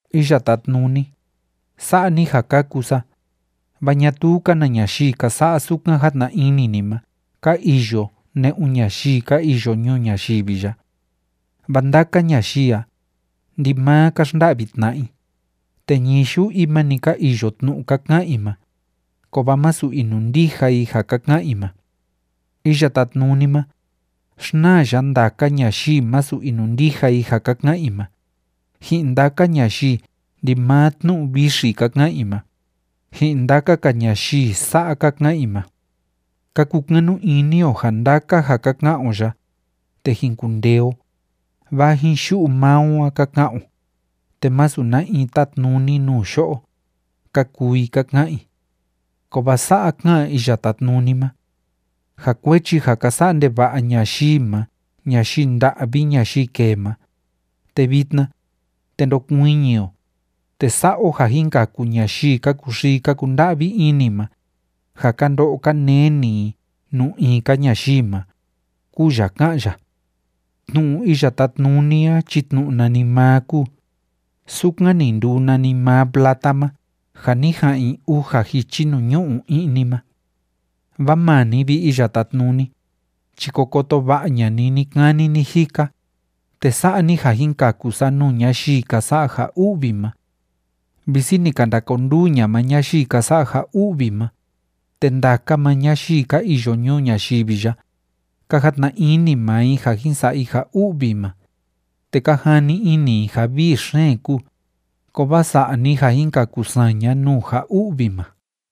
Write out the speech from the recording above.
Iya Tátnuni, sa'a ni ja kaku sa, vaa ñatuu‑ka na ñayii ka sa'a sukan jatna ini ni ma ka iyo ne'un ñayii ka iyo ñuu ñayivi ya. Vaa ndaka ñayii a, ndimaa ka xnda'vi tna'a i, te ñii yu'u i ma‑ni ka iyo tnu'u ka ka'an i ma, kovaa masu inundija i ja ka ka'an i ma. Iya Tátnuni ma, xnaa ya ndaka ñayii masu inundija i ja ka ka'an i ma, ji'in ndaka ñayii ndimaa tnu'u vixi ka ka'an i ma, ji'in ndaka‑ka ñayii sa'a ka ka'an i ma: “Ka kukanu ini o ja ndaka ja ka ka'an o ya, te jin kundee o, vaa ji'in yu'u maa o a ka ka'an o, te masu na in tátnuni nuu yo'o”, ka kuu i ka ka'an i. Kovaa sa'a ká'an Iya Tátnuni ma: “Ja kuechi ja ka sa'a ndeva'a ñayii ma ñayii nda'vi ñayii kee ma, te vitna, te ndokuiñi o, te sa'a o ja jin kaku ñayii ka kuxii ka kunda'vi ini ma, ja ka ndo'o ka neni i nuu in‑ka ñayii ma”, kúu ya ká'an ya. Tnu'u Iya Tátnuni a chi tnu'u nanimaa kúu, sukan ni nduu nanimaa plata ma ja ni ja'an i uja jichi nuu ñu'u i'ni ma. Vaa maa ni, vi Iya Tátnuni, chi ko koto va'a ña'a ni ni‑kani ni‑jika, te sa'a ni ja jin kaku sa nuu ñayii ka sa'a ja u'vi ma. Visi ni ka ndakonduu ña'a maa ñayii ka sa'a ja u'vi ma, te ndaka maa ñayii ka iyo ñuu ñayivi ya, ka jatna maa i ja jin sa'a i ja u'vi ma, te ka jani ini i ja vii xeen kúu, kovaa sa'a ni ja jin kaku saña nuu ja u'vi ma.